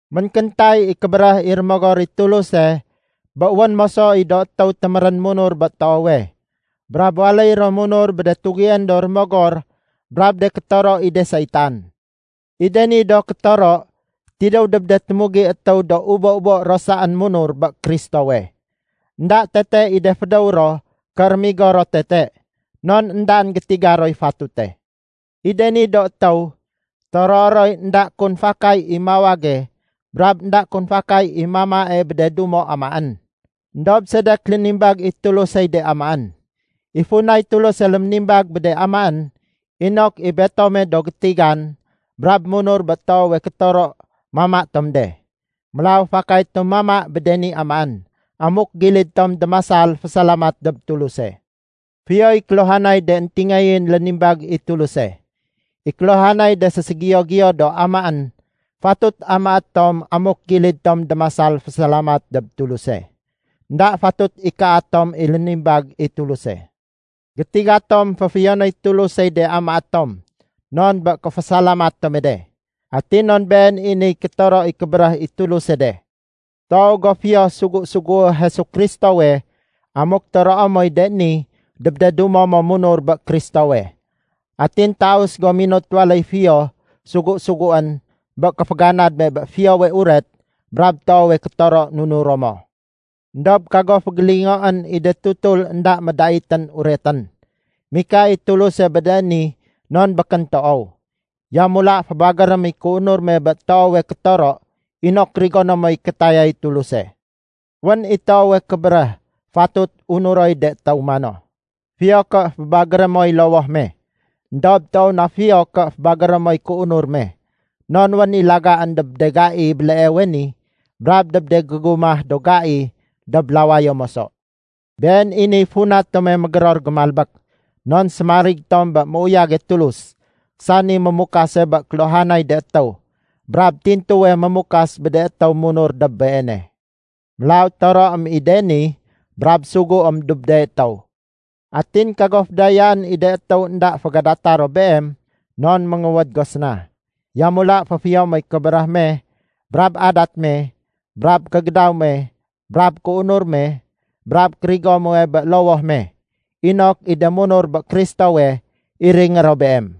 Ménkéntay i kébéréh i Rémogor i Tuluse bé wén moso i do étéw témérén munur bé toowe, brab waléy ro munur bé de tugién do rémogor brab de kétoro i de saitan. I de ni do kétoro tidéw dob de témugi étéw do ubo-ubo ro saén munur bé Kristowe. Enda tete i de fédéw ro ké rémigo ro tete non éndaén gétiga roy fatute. I de ni do étéw toroé roy énda kun fakay i mawage brab énda kun fakay i mamae bé de dumo anaén. Endob sedek lénimbag i Tulusey de amaén? I funay Tuluse léménimbag bé de amaén inok i betom do gétigan brab munur bé toowe kétoro mama tom de. Mélaw fakay tom mama bé de ni amaén amuk gilid tom démasal fésalamat dob Tuluse. Fiyoy kéluhanay de éntingayén lénimbag i Tuluse. I kéluhanay de séségiyo-giyo do amaén fatut amaén tom amuk gilid tom démasal fésalamat dob Tuluse. Enda fatut ikaa tom i lénimbag i Tuluse. Gétiga tom féfiyonéy Tulusey de amaé tom non bé kéfésalamat tome de, atin non been i niy kétoro i kébéréh i Tuluse de. Toow go fiyo sugu-sugué Jesu Kristowe amuk toroé moy de ni dob de dumo mo munur bé Kristowe. Atin taus go minut waléy fiyo sugu-suguén bé kéféganad me bé Fiyowe Uret brab toowe kétoro nunuro mo. Endob kago fégélingoén i de tutul énda médaitén uretén. Mika i Tuluse bé de ni non békén toow. Yamula fébagérém i kéunur me bé toowe kétoro inok rigoné moy kétayay Tuluse. Wén i toowe kébéréh, fatut unuroy de étéw mano, “Fiyo ké fébagéré moy lowoh me. Endob toow na fiyo ké fébagéré moy kéunur me, non wén i lagaén dob de gai béleewe ni brab dob de gégumah do gai dob lawayo moso.” Been i niy funa tome mégéror gémalbék, non sémarig tom bé méuyage Tulus, sani mémukase bé kéluhanay de étéw, brab tintuwe mémukas bé de étéw munur dob Beene. Mélaw toroém i de ni brab suguém dob de étéw. Atin kago fédayaén i de étéw énda fégadata ro beem non ménguwéd go séna. Yamula féfiyo moy kébéréh me brab adat me brab kégédaw me brab kéunur me brab kérigo muwe bé lowoh me, inok i de munur bé Kristowe iringé ro beem.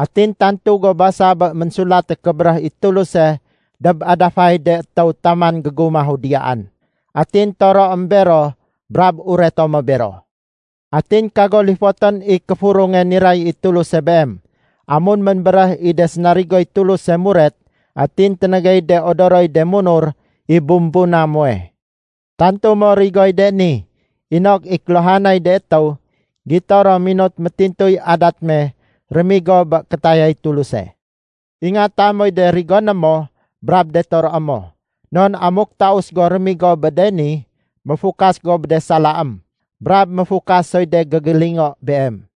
Atin tantu go basa bé Ménsulate Kébéréh i Tuluse dob adafay de étéw taman gégumahu diyaan. Atin toroém bero brab ureto mo bero. Atin kago lifotén i kéfurunge niray i Tuluse beem amun ménbéréh i de sénarigoy Tuluse muret atin ténégéy de odoroy de munur i bumbuna muwe. Tantu mo rigoy de ni inok i kéluhanay de étéw gito ro minut métintuy adat me rémigo bé kétayay Tuluse. Ingata moy de rigoné mo brab de toroé mo. Non amuk taus go rémigo bé de ni, méfukas go bé de salaém brab méfukas soy de gégélingo beem.